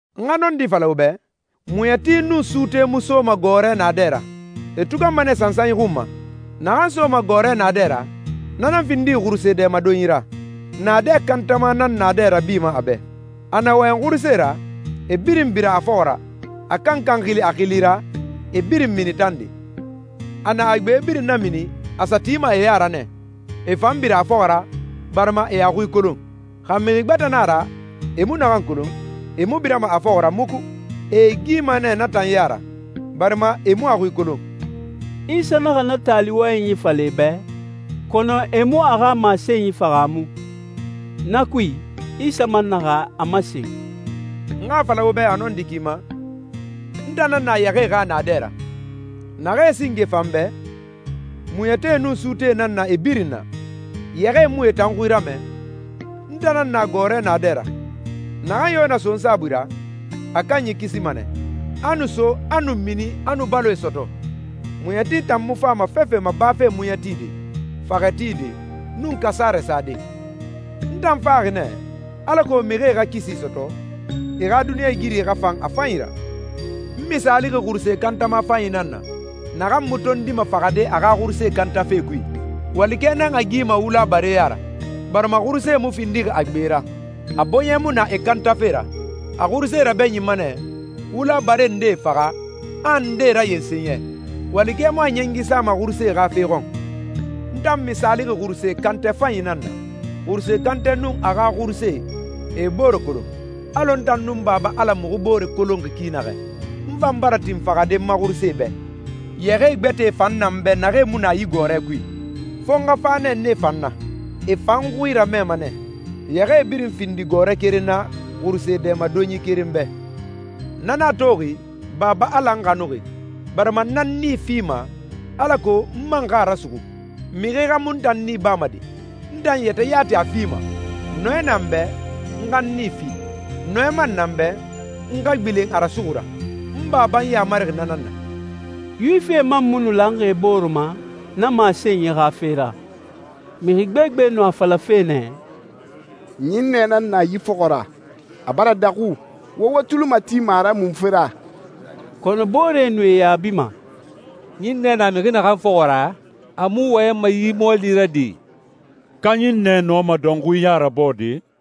«N xa nɔndi fala wo bɛ, muɲɛti nun suute mu soma gɔɔrɛ naadɛ ra. E tuganma nɛ sansanyi xun ma. Naxan soma gɔɔrɛ naadɛ ra, na nan findixi xuruse dɛmadonyi ra. Naadɛ kantama nan naadɛ rabima a bɛ. A na wɔyɛn xurusee ra, e birin bira a fɔxɔ ra. A kankan xili a xili ra, e birin mini tande. A na a gbe birin namini, a sa tima e ya ra nɛ, e fan bira a fɔxɔ ra, barima e a xui kolon. Xa mixi gbɛtɛ na a ra e mu naxan kolon, e mu birama a fɔxɔ ra muku. E e gima nɛ na tan ya ra, barima e mu a xui kolon.» Isa naxa na taali wɔyɛnyi fala e bɛ, kɔnɔ e mu a xa masenyi fahaamu. Na kui, Isa man naxa a masen, «N xa a fala wo bɛ a nɔndi ki ma, n tan nan na yɛxɛɛe xa naadɛ ra. Naxee singe fa n bɛ, muɲɛtie nun suutee nan na e birin na. Yɛxɛɛe mu e tan xui ramɛ. N tan nan na gɔɔrɛ naadɛ ra. Naxan yo na so n saabui ra, a kanyi kisima nɛ, a nu so, a nu mini, a nu baloe sɔtɔ. Muɲɛti tan mu fama fefe ma bafe muɲɛ tide, faxɛ tide, nun kasarɛ sade. N tan faxi nɛ, alako mixie xa kisi sɔtɔ, e xa duniɲɛigiri xa fan a fanyi ra.» «N misaalixi xuruse kantama fanyi nan na, naxan mu tondima faxade a xa xuruse kantɛ kui. Walikɛ nan a gima wula bare ya ra, barima xurusee mu findixi a gbe ra, a bɔɲɛ mu na e kantafe ra. A xurusee rabɛɲinma nɛ, wula bare ndee faxa, a ndee rayensen yɛ. Walikɛ mu a ɲɛngi sama xurusee xa fe xɔn. N tan misaalixi xuruse kantɛ fanyi nan na. Xurusee kantɛ nun a xa xurusee, e e bore kolon, alɔ n tan nun Baba Ala muxu muxu bore kolonxi ki naxɛ. N fan bara tin faxade n ma xurusee bɛ.» «Yɛxɛɛ gbɛtɛe fan na n bɛ naxee mu na yi gɔɔrɛ kui. Fo n xa fa nɛ nee fan na. E fan n xui ramɛma nɛ, yɛxɛɛe birin findi gɔɔrɛ keren na, xuruse dɛmadonyi keren bɛ. Na nan a toxi Baba Ala n xanuxi, barima n nan n nii fima, alako n man xa a rasuxu. Mixi xa mu n tan nii bama de, n tan yɛtɛ yati a fima. Nɔɛ na n bɛ, n xa n nii fi. Nɔɛ man na n bɛ, n xa gbilen a rasuxu ra. N Baba n yamarixi na nan na.» Yuwifie man mu nu lanxi e bore ma na masenyi xa fe ra. Mixi gbegbe nu a falafe nɛ, «Ɲinnɛ nan na yi fɔxɔ ra. A bara daxu. Wo wo tuli matima a ra munfe ra?» Kɔnɔ booree nu e yaabima, «Ɲinnɛ na mixi naxan fɔxɔ ra, a mu wɔyɛnma yi mɔɔli ra de! Ka ɲinnɛ nɔma dɔnxui ya rabɔɔde?»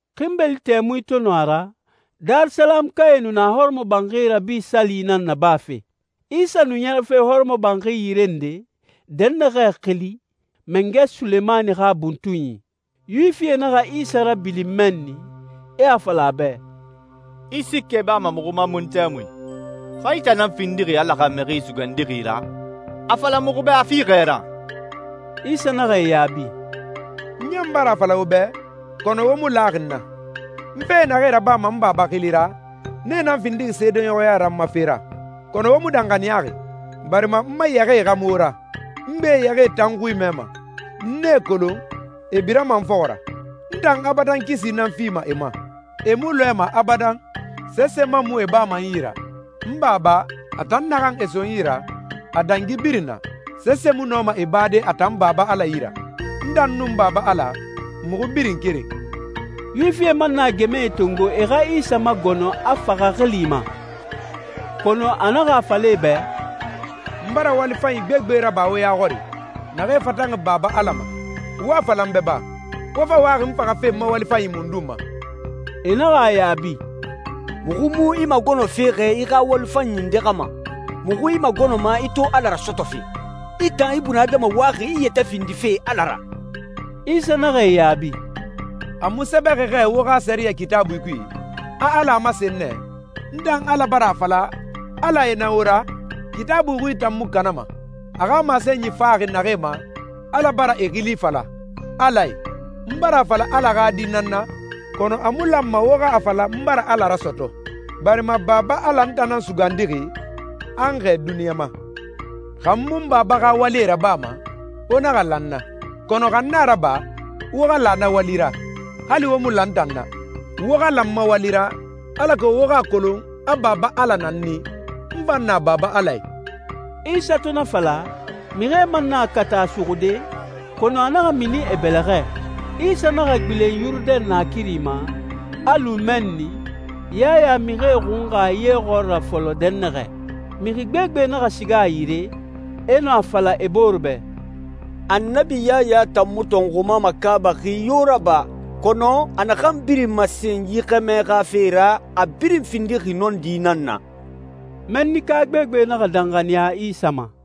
Xinbeli tɛmui to nu a ra, Darisalamukae nu na Hɔrɔmɔbanxi Rabi Sali nan nabafe. Isa nu ɲɛrɛfe hɔrɔmɔbanxi yire nde, dɛnnaxɛ xili «Mangɛ Sulemani xa buntunyi.» Yuwifie naxa Isa rabilin mɛnni, e a fala a bɛ, «I siikɛ bama muxu ma mun tɛmui? Xa i tan nan findixi Ala xa Mixi Sugandixi ra, a fala muxu bɛ a fiixɛ ra.» Isa naxa e yaabi, «N ɲan bara a fala wo bɛ, kɔnɔ wo mu laxi n na. N fe naxee rabama n Baba xili ra, nee nan findixi seedeɲɔxɔya ra n ma fe ra. Kɔnɔ wo mu danxaniyaxi, barima n ma yɛxɛɛe xa mu wo ra. N gbe yɛxɛɛe tan n xui mɛma, n e kolon, e birama n fɔxɔ ra. N tan abadan kisi nan fima e ma. E mu lɔɛma abadan, sese man mu e bama n yi ra. N Baba, a tan naxan e so n yi ra, a dangi birin na. Sese mu nɔma e bade a tan Baba Ala yi ra. N tan nun Baba Ala, muxu birin keren.» Yuwifie man naxa gɛmɛe tongo, e xa Isa magɔnɔ a faxa xili ma, kɔnɔ a naxa a fala e bɛ, «N bara wali fanyi gbegbe raba wo ya xɔri, naxee fatanxi Baba Ala ma. Wo a fala n bɛ ba, wo fa waxi n faxafe n ma wali fanyi mundun ma?» E naxa a yaabi, «Muxu mu i magɔnɔfe xɛ i xa wali fanyi nde xa ma. Muxu i magɔnɔma i to Ala rasɔtɔfe. I tan ibunadama waxi i yɛtɛ findife Ala ra!» Isa naxa e yaabi, «A mu sɛbɛxi xɛ wo xa sɛriyɛ Kitaabui kui, a Ala a masen nɛ, ‹N tan Ala bara a fala, alae nan wo ra›? Kitaabui xui tan mu kanama. A xa masenyi faxi naxee ma, Ala bara e xili fala, ‹alae›. N bara a fala Ala xa Di nan n na, kɔnɔ a mu lanma wo xa a fala n bara Ala rasɔtɔ, barima Baba Ala n tan nan sugandixi, a n xɛɛ duniɲa ma. Xa n mu n Baba xa walie xa rabama, wo naxa la n na. Kɔnɔ xa n a raba, wo xa la na wali ra, hali wo mu la n tan na. Wo xa la n ma wali ra, alako wo xa a kolon a Baba Ala na n i, n fan na Baba Ala i.» Isa to na fala, mixie man naxa kata a suxude, kɔnɔ a naxa mini e bɛlɛxɛ. Isa naxa gbilen Yurudɛn naakiri ma, a lu mɛnni, Yaya mixie xunxa ye xɔɔra fɔlɔ dɛnnaxɛ. Mixi gbegbe naxa siga a yire, e nu a fala e bore bɛ, «Annabi Yaya tan mu tɔnxuma makaabaxi yo raba, kɔnɔ a naxan birin masen yi xɛmɛ xa fe ra, a birin findixi nɔndi nan na.» Mɛnnika gbegbe naxa danxaniya Isa ma.